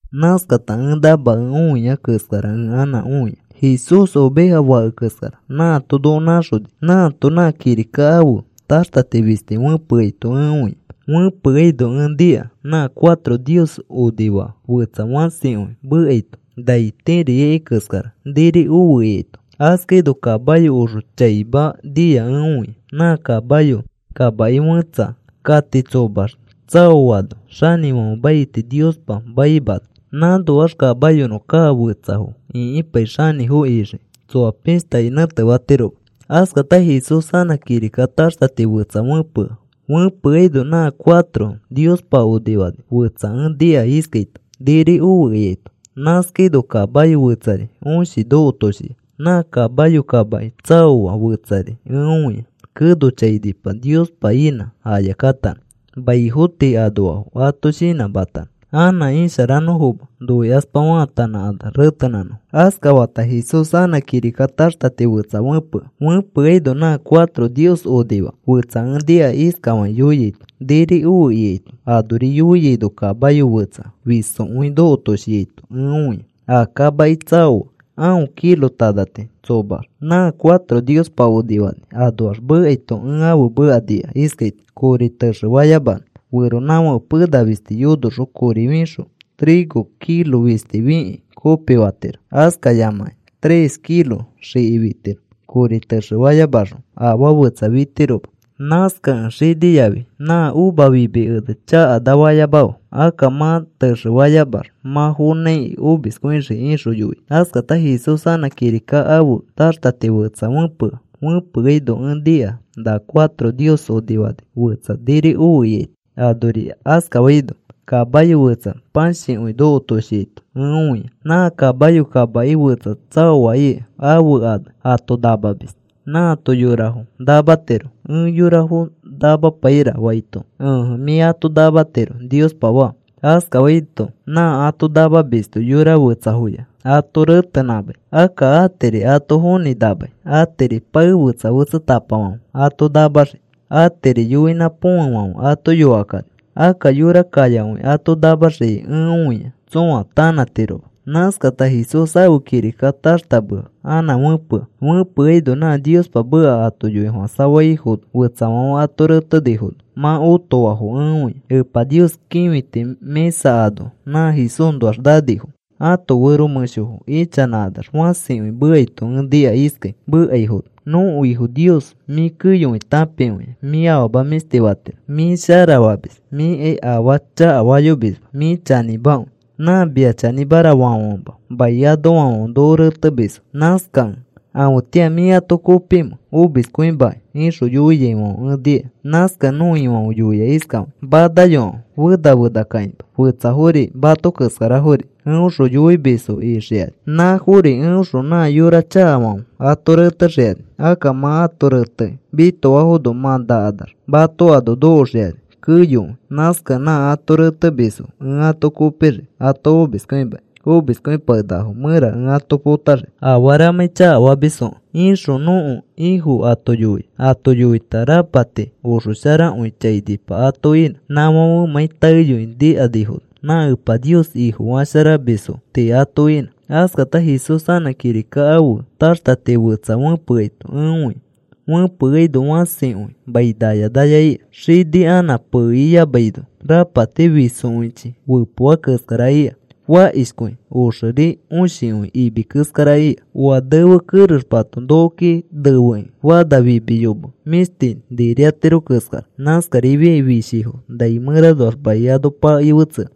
Nãskata ẽ namakẽ õiai keskara ẽ anã õia. Jesús oveja fake keskara nãato noko nãxoni nãato nã kirika ãfe taxtati fisti fẽpeaito ẽ õia. Fẽpeaino ẽ nika nã cuatro Nios onifaa fetsa fãsikõi mekaito nai tiri ikai keskara: “Niri ofe,” ikaito. Askaino kamayo oxo chaima nia ẽ õia. Nã kamayo kamaki fẽtsa kati tsomax tsaoano xanĩfãfe maiti Niospa maimana. Nãnoax kamayonõ kaa fetsafo ĩkipai xanĩfo ixiki. Tsoa pishtakai nẽtefatiroma. Askata Jesús anã kirika taxtati fetsa fẽpea. Fẽpeaino nã cuatro Niospa onifani fetsa ẽ nika iskaito: “Niri ofe,” ikaito. Nãskafaino kamayo fetsari õshi nokotoshia. Nã kamayo kamaki tsaoa fetsari ẽ õia. Keno chainipa Niospa inã aya katanõ maifo tii anoafo ato shinãmatanõ anã isharanõfoma noikaspa faatanãkanax retenãnõfo. Askatafata Jesús anã kirika taxtati fetsa fẽpea. Fẽpeaino nã cuatro Nios onifaa fetsa ẽ nika iskafakĩ yoiaito: “Niri ofe,” ikaito. Anori yoiaino kamayo fetsa fisokõi nokotoshiaito ẽ õia. A kamaki tsaoa aõ kilo tanati tsomax. Nã cuatro Niospa onifani anoax mekaito ẽ ãfe meka nika iskaito: “Kori texe fayamanõ, feronãfãke pena fisti yonoxõ kori fixõ trigo kilo fisti fikĩ kopifatiro. Askayamakĩ tres kilo xiki fitiro. Kori texefayamaxõ afaa fetsa fitiroma. Nãskakẽ xini yafi nã uva fimi ene chakanafayamafe. Akka mã texefayamax mã fonãiki omiskõixii,” ixõ yoia. Askata Jesús anã kirika ãfe taxtati fetsa fẽpea. Fẽpeaino ẽ nika na cuatro Nios onifani fetsa, “Niri ofe,” ikaito. Anori askafaino kamayo fetsa pãshikõi nokotoshiaito ẽ õia. Nã kamayo kamaki fetsa tsaoa ika ãfe ane Ato Namamis. Nãato yorafo namatiro. “Ẽ yorafo namapaira,” faito, “Ẽje. Mĩ ato namatiro,” Niospa faa. Askafaito nã ato namamisto yora fetsafoya ato retenãmai. Akka atiri ato fonĩ namai, atiri pae fetsa fetsatapafãfe ato namaxii, atiri yoinã põfefãfe ato yokakani. Akka yora kayakõi ato namaxiai ẽ õia tsõa ato tanãtiroma. Nãskata Jesús ãfe kirika taxtamea anã fẽpea. Fẽpeaino nã Niospa meka ato yoifofãsafaifono fetsafãfe ato retefinifono mã otoafo ẽ õia. Epa Nios kĩfiti mĩsa ano nã Jesúsnoax nanifo ãto fero mẽshofo ichanãkanax fãsikõi mekaito ẽ nika iskai mekaifono: “Nõko Ifo Nios, mĩ keyokõi tãpikõia. Mĩ afama mĩshti fatiro. Mĩ shara famis. Mĩkai afaa chakafayomisma. Mĩ chanĩmakõi. Nã mia chanĩmara faafãfema mai anoafãfe noko retemisfo. Nãskakẽ, ¿afetĩa mĩ ato kopimẽ omiskõimakĩ?” ixõ yoiaifãfe ẽ nika. Nãskakẽ nõko Ifãfe yoia isfakĩ: “Manayokãfe. Fena fena kakĩma. Fetsafori mato keskarafori eõxõ yonomisfo ixikani. Nãfori eõxõ nã yora chakafãfe ato retexikani. Akka mã ato retekĩ mitoafono mã nakanax mato ano nokoxikani keyokõi. Nãskakẽ nã ato retemisfo ẽ ato kopixii ato omiskõimakĩ omiskõipakenakafo mẽra ẽ ato potaxii afaramãi chakafamisfokẽ,” ixõ nõko Ifo ato yoia. Ato yoita rapati oxosharakõi chainipa ato inã, nãfãfemãi taeyoi nikanifono nã Epa Nios Ifofasharamisfo tii ato inã. Askata Jesús anã kirika ãfe taxtati fetsa fẽpeaito ẽ õia. Fẽpeaino fãsikõi mai naya naya ika. Xini anã pee iyamaino, rapati fisokõichi fepoa keskara ika, fakishkõi. Oxeri õshikõi imi keskara ika. Oa nefe kerexepato nokoki nefekĩ fana fimi yome mĩshti niriatiro keskara. Nãskarifiai fishifo nai mẽranoax mai ano pakei fetsea.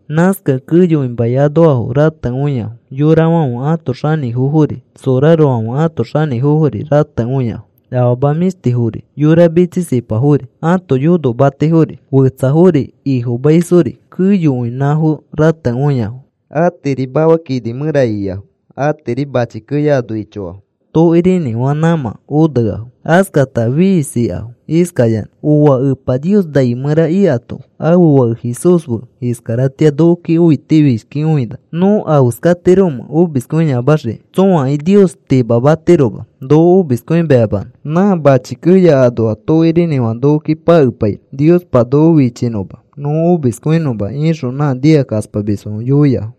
Nãskakẽ keyokõi mai anoafo ratekõiafo. Yorafãfe ãto xanĩfofori sorarofãfe ãto xanĩfofori ratekõiafo; afama mĩshtiyafori, yora mitsisipafori, ãto yonomatifori, fetsafori ifomaisfori keyokõi nãfo ratekõiafo. A tiiri mafa kini mẽra ikiafo. A tiiri mãchi keya ano ichoafo tokirinĩfã nãmã oneafo. Askata fiisikafo iskayanã: “¡Ooa! Epa Nios nai mẽra ikato ãfe Fake Jesús fe iskaratĩa nokoki õitifishkikõina. ¿Nõ afeskatiromẽ omiskõiyamaxiki? Tsõakai Nios timamatiroma noko omiskõimayamanõ. Nã mãchi keya anoa tokirinĩfã nokoki pakepainõ Niospa noko fichinõma nõ omiskõinõma,” ixõ nã nikakaspamisfãfe yoiafo.